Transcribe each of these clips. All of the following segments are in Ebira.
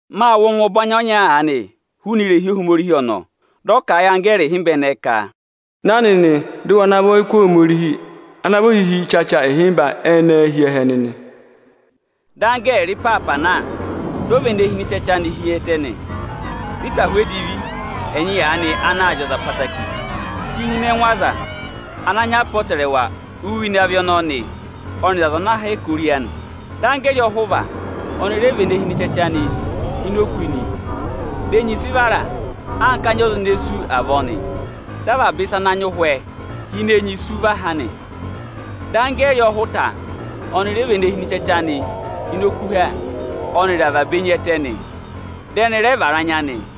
Mâ wụ́ ọngwẹ ọbanyị ọnya aanị hụụnị irehi Ohomorihi ọnọọ, dị ọ kà a yị anggẹẹrị ịhịmba ẹnẹẹ ka: Ẹ̀ na dị ẹ̀ na và ọyịkụ Ohomorihi ana vị ohihi ịchacha ịhịmba ẹnẹẹ hi ẹhẹ nị. Dị anggẹẹrị ịpaapa na, dị ọ na và ene hi ịnị ịchacha anị hi ẹtẹ nị. Dị ịtahụ edivi ẹnyị aanị anaā zị ọza ẹtẹẹtẹrẹ chị hi ịnị ẹngụ aza ana nyị apọtẹrẹwa uye ịnị avị ọnọọ ọnị aza ana hẹkẹ ori anị nị. Dị anggẹẹrị ọhụva ọnị rẹ và ene hi ịnị ịchacha anị hi ini òkū nị. Di enyi sị vara anka anya ọza ene sú avọọ nị. Dị avaba ịsa ana nyị ụhwẹ ene hi ini òkū sú va ha nị. Anggẹẹrị ọhụta ọnị ọ rẹ và ene hi ịnị ịchacha ene hi ịnị ịchacha anị hi ini okuha ọnịrị avaba enyi ẹtẹ, dị ẹnị rẹ vara anya nị.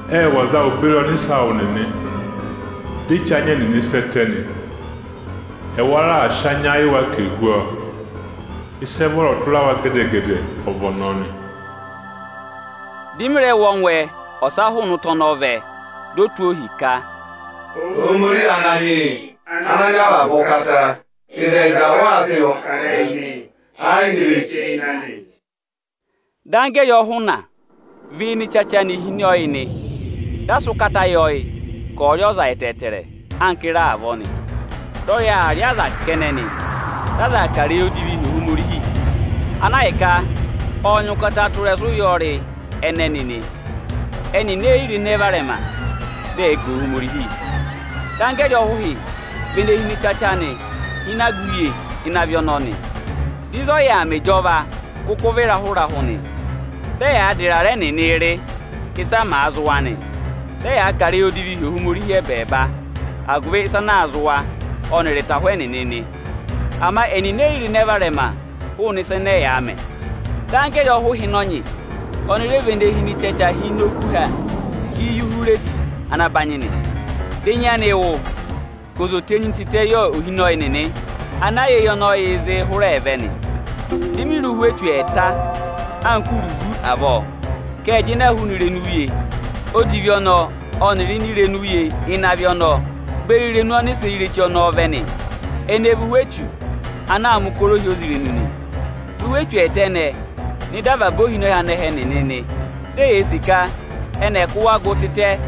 Ệ wụ̀ aza awụ beri ọnịsẹ awụ nịnị, dị e che anya ẹnịnị sẹ́ ẹtẹ nị. Ẹwa rẹ raà sị anya yị wa ka èe hụ́ ọọ. Ịsị ẹ vọrọ tụra wa gẹdẹ-gẹdẹ ọ vị ọnọọ nị. Dị mị rẹ wụ́ ọngwẹ ọsa hụụnị ụta ọnọọ vẹ, dị ọ tụ́ ohi ka, “Ohomorihi Ananyị yị Ochẹtẹngụ, ịzẹyịza ụ waa sịị mẹ̀ ọkarẹyị nị, ẹ yị nyị ireche ịnị anị.” Dị anggẹẹrị ọhụna và ịsa ene hi ini ịchacha anị hi ịnị ọyị nị. Dị a sị ụkata yị ọyị ka ọ̀ọ rị ọza ẹtẹẹtẹrẹ anka ịra avọọ nị. Dị ọyị aa rị aza kẹnẹ nị. Dị aza aa kà ịrẹyị odivii hi Ohomorihi, ana ahịka ọ́ọ nyị ụkata tụ́ ịrẹsụ ụyọrị ẹnẹnị nị. Ẹnịnị eyi ro ịnẹ varẹma, dị ẹ̀ẹ ga Ohomorihi. Dị anggẹẹrị ọhụhị và ene hi ịnị ịchacha anị hi ịnị aga uye ịnị avị ọnọọ nị. Dị ịzị ọ yà aa mẹ ịjọva kụkụ vị ịrahụ-ịrahụ nị. Dị ẹyaa dà ịrarẹ ẹnịnị rị, ịsa màa zị wa nị. Dị ẹyaa kà ịrẹyị odivii hi Ohomorihi ẹbẹẹba agụvị ịsa ana aa zị wa ọnịrị ịtahụ ẹnịnị nị. Ama ẹnịnị eyi ro ịnẹ varẹma hụụnị ịsa ẹnẹ ẹyaa mẹ. Dị anggẹẹrị ọhụhịnọnyị ọnị rẹ và ene hi ịnị ịchacha hi ini okuha Iyuhureti ana banyị nị. Dị enyi anị wụ, ka oze ò tenyi tịtẹ yị ohinọyị nịnị ana yà eyi ọnị ọyịị̄ zịị hụrẹẹ vẹ nị. Di mi re ụhwẹ echu ẹẹta anka uruvu avọọ ka ẹ́ẹ jịnẹ hụụnị irenu uye odivi ọnọọ ọnịrị ini irenu uye ịnị avị ọnọọ beri irenu ọnịsẹ ireche ọnọọ vẹ nị. Ẹnị ẹ vị ụhwẹ echu ana aa mẹ̀ ụkọrọ ohyozirenu nị. Dị ụhwẹ echu ẹẹta ẹnẹẹ nọ ịda avaba ohinọyị anẹhẹ nịnị nị. Di eyee sì ka ẹnị ẹ̀ kụ́ wa gụ tịtẹ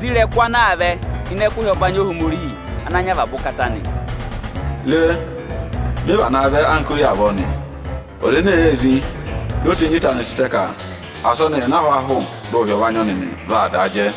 zí ịrẹkụ ana aa vẹ ịnị ẹkụhị ọbanyị Ohomorihi Ochẹtẹngụ nị. “Re! Mị vanaa vẹ anka oyi avọọ nị. Ọza eme èee zí di o tenyi ịta anị tịtẹ ka asị ọnị na yà ịnị ahwaahụ dị ụhị ọ̀ vaa nyị ọọ nị, vaa daa jẹ.”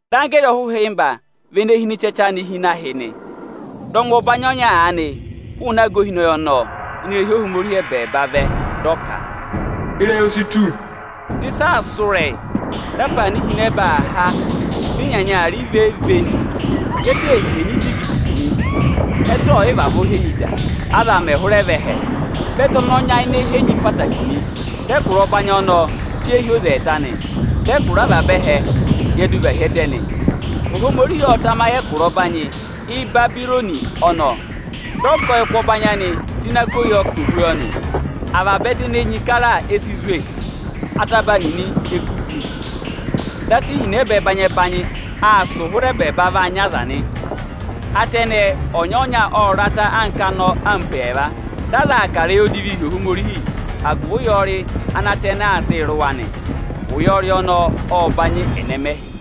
Dị anggẹẹrị ọhụhịmba và ene hi ịnị ịchacha anị hi ịnị ahị nị. Dị ọngwẹ ọbanyị ọnya aanị hụụnị aga ohinọyị ọnọọ ini irehi Ohomorihi ẹbẹẹba vẹ, dị ọ ka, “Ịrẹyị o si tù!” Dị ịsa aa sụ́ ịrẹyị, dị apaana ihinẹba aa há dị ịnyanya aa rị vee-vee nị. Dị ẹtẹ henyi jigi-jigi nị. Ẹtẹ ọọ̀ yị vavọọ henyi da, aza mẹ̀ hụrẹ vẹ ẹhẹ. Vị ẹtẹ ọnọọ nyayịnẹ henyi ẹtẹẹtẹrẹ nị. Dị ẹkụra ọbanyị ọnọọ che hi oze ẹẹta nị. Dị ẹkụra avaba ẹhẹ hyẹdụ va hi ẹtẹ nị. Ohomorihi ọ́ọ tamayị ẹkụra ọbanyị Ịbabịrọnị ọnọọ, dị ọ ká ọyịkụ ọbanyị anị tụ́ ini ako yọ ka ò hú ọọ nị. Avaba ẹtẹ ene enyi kara e si zwe, ataba nịnị e kú vú. Dị ata ihinẹba ẹbanyị-ẹbanyị aa sụ̀ụ hụrẹ ẹbẹẹba vaa nya aza nị. Ata ẹnẹẹ, ọnya-ọnya ọ́ọ rata anka anọ ampo ẹẹva. Dị aza aa kà ịrẹyị odivii hi Ohomorihi agụvị ụyọrị ana ata ẹnẹẹ aa sịị rị wa nị. Ụyọrị ọnọọ ọ́ọ banyị ẹnẹmẹhị.